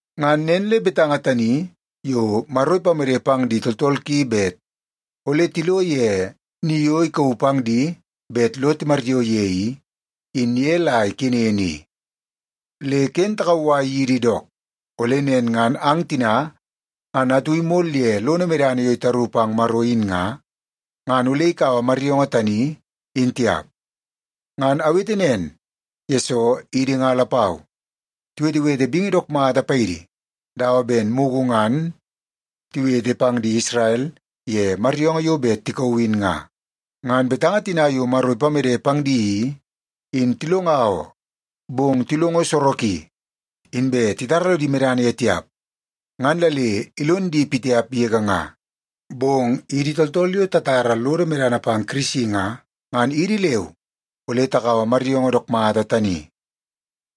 Ngan nen le betanga tani yo Maro ipamede pang di tooltool ki bet ole tilo ye ni yo ikauu pang di bet lo timaryoo ye i, in ye la ikenen i. Le ken takauwai yidi dook, ole nen ngan ang tina ngan atu imol ye lono medana yo itaru pang Maro in nga, ngan ole ikaua maryoongoo tani, in tiap. Ngan awete nen, yesoo idi nga lapau, tiwetewete bingi dook mata paidi dawa ben mugu ngan tiwete pang di Isrel ye maryoongoo yo bet tikauu in nga. Ngan betanga tina yo Maro ipamede pang di i, in tilonga oo, bong tilongo soroki, inbe titara lodi medana ye tiap, ngan la le ilon di pitiap yege nga. Bong idi tooltool yo tatara lodo medana pang Kirisi nga, ngan idi leu ole takaua maryoongoo dook mata tani.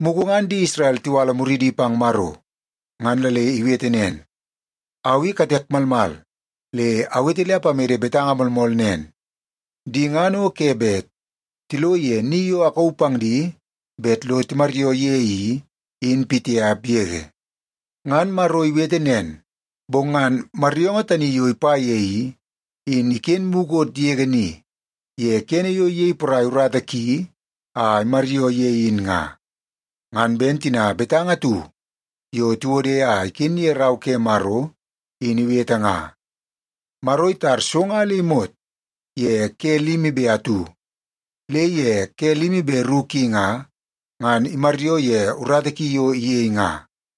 Mugu ngan di Isrel tiwala muridi pang Maro, ngan la le iwete nen, “Au i katek malmal le awete le apamede betanga moolmool nen, ‘Di ngan o ke bet tilo ye ni yo akauu pang di bet lo timaryoo ye i, in pitiap yege.’” Ngan Maro iwete nen, bong ngan maryoongoo tani yo ipa ye i, in iken mukot yege ni ye kene yo iyei porai urata ki a imaryoo ye in nga. Ngan ben tina betanga atu yo tiwode a iken ye Rau ke Maro in iwete nga, “Maro itar so nga le imot ye ke limi be atu, le ye ke limi be ru ki nga, ngan imaryoo ye urata ki yo iyei nga.”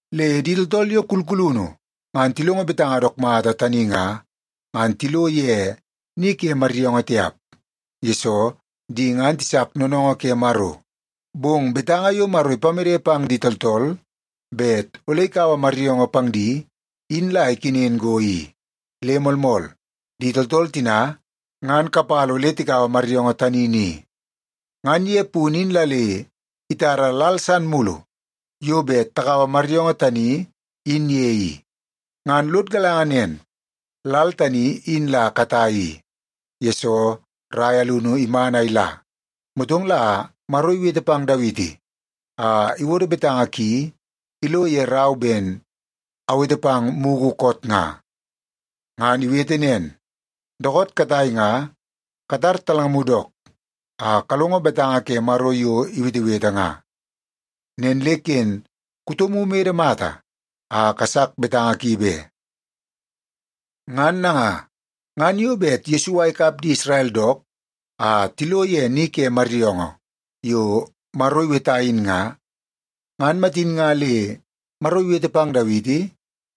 Le di tooltool yo kulkulunu ngan tilongo betanga dook mata tani nga, ngan tilo ye ni ke maryoongoo tiap, yesoo di ngan tisak noonoongoo ke Maro. Bong betanga yo Maro ipamede pang di tooltool bet ole ikaua maryoongoo pang di, in la ikenen go i, le moolmool, di tooltool tina ngan kapala ole tikaua maryoongoo tani ni. Ngan ye punu in la le itara lal san mulu yo bet takaua maryoongoo tani in ye i. Ngan lod galanga nen lal tani in la katai i, yesoo rai alunu iman a ila, motong la Maro iwete pang Dawiti a iwodo betanga ki ilo ye rau ben awete pang mugu koot nga. Ngan iwete nen, “Dookoot katai nga katar talngamu dook, a kalongo betanga ke Maro yo iwetewete nga. Nen le ken kutomu imede mata a kasak betanga ki be.” Ngan nanga, ngan yo bet Yesua ikap di Isrel dook a tilo ye ni ke maryoongoo yo Maro iweta in nga, ngan matin nga le Maro iwete pang Dawiti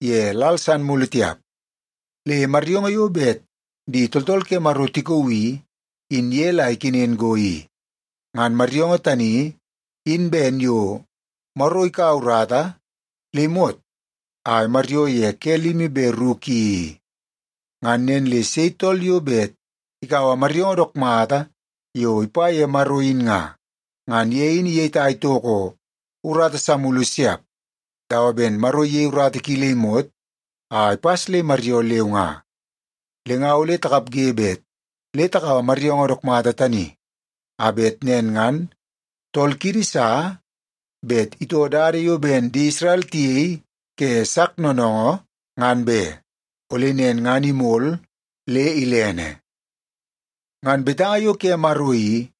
ye lal san mulu tiap. Le maryoongoo yo bet di tooltool ke Maro tikauu i, in ye la ikenen go i. Ngan maryoongoo tani in ben yo Maro ikaua urata le imot a imaryoo ye ke limi be ru ki i. Ngan nen le sei tool yo bet ikaua maryoongoo dook mata yo ipa ye Maro in nga, ngan ye in iyetai toko urata sa mulu siap, dawa ben Maro iyei urata ki le imot a ipas le imaryoo leu nga. Le nga ole takapge bet le takaua maryoongoo dook mata tani, a bet nen ngan tool kiidi sa bet itoo dada yo ben di Isrel tiyei ke sak noonoongoo, ngan be. Ole nen ngan imol le ilene. Ngan betanga yo ke Maro i,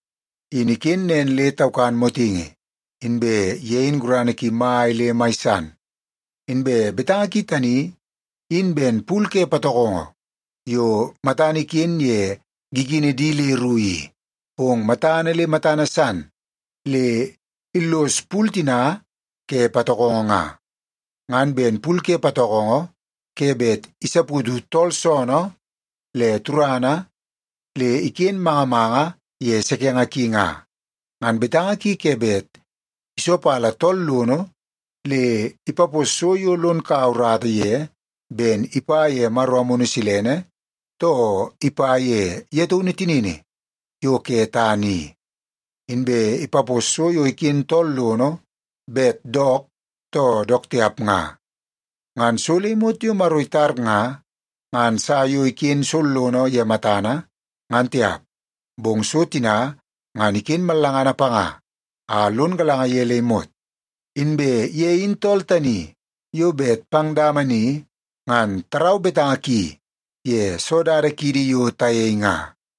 in iken nen le taukan motingi, inbe ye in gurana ki mai le mai san. Inbe betanga ki tani in ben pul ke patokongo yo matana iken ye gigini di le ru i, bong matana le matana san le illos pul tina ke patokongo nga. Ngan ben pul ke patokongo ke bet isaputu tool soonoo le turana le iken manga manga ye sekenge ki nga, ngan betanga ki ke bet isopala tool lono le ipapos so yo lon kaua urata ye ben ipa ye Maro Amunu Silene, too ipa ye ye taunu tinini yo ke tana i. Inbe ipapos so yo iken tool lono bet dook too dook tiap nga. Ngan so le imot yo Maro itar nga, ngan sa yo iken sollono ye matana, ngan tiap, bong so tina ngan iken mallangana panga a lon galanga ye le imot. Inbe ye in tool tani yo bet pang dama ni ngan tarau betanga ki ye soo dada kiidi yo tayei nga.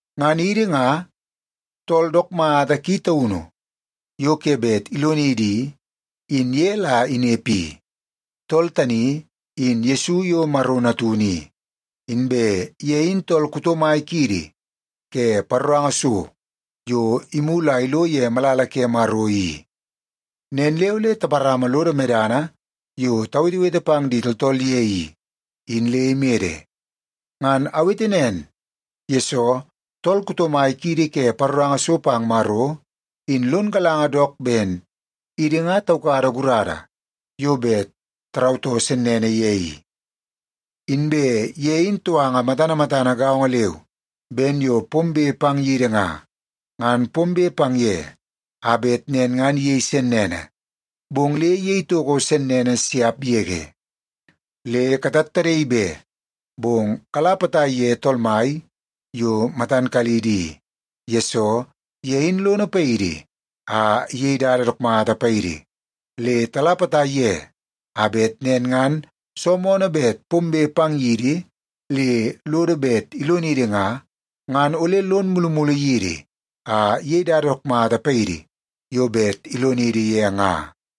Ngan idi nga, tool dook mata ki taunu yo ke bet ilonidi i, in ye la inepe i. Tool tani in Yesu yo Maro Natunu i, inbe ye in tool kuto mai kiidi ke paroranga so yo imulu a ilo ye malala ke Maro i. Nen le ole taparama lodo medana yo tawetewete pang di tooltool ye i, in le imede. Ngan awete nen, yesoo tool kuto mai kiidi ke paroranga so pang Maro, in lon galanga dook ben idi nga taukada gurada yo bet tarautoo sennene ye i. Inbe ye in touanga matana matana gaongo leu ben yo pombe pang yidi nga, ngan pombe pang ye a bet nen ngan iyei sennene, bong le iyei toko sennene siap yege. Le katattadaii be, bong kala potai ye Tool Mai yo matan kalidi i, yesoo ye in lono paidi a iyei dada dook mata paidi. Le tala potai ye a bet nen ngan soo moonoo bet pombe pang yidi le lodo bet ilonidi nga, ngan ole lon mulumulu yidi a iyei dada dook mata paidi yo bet ilonidi ye nga.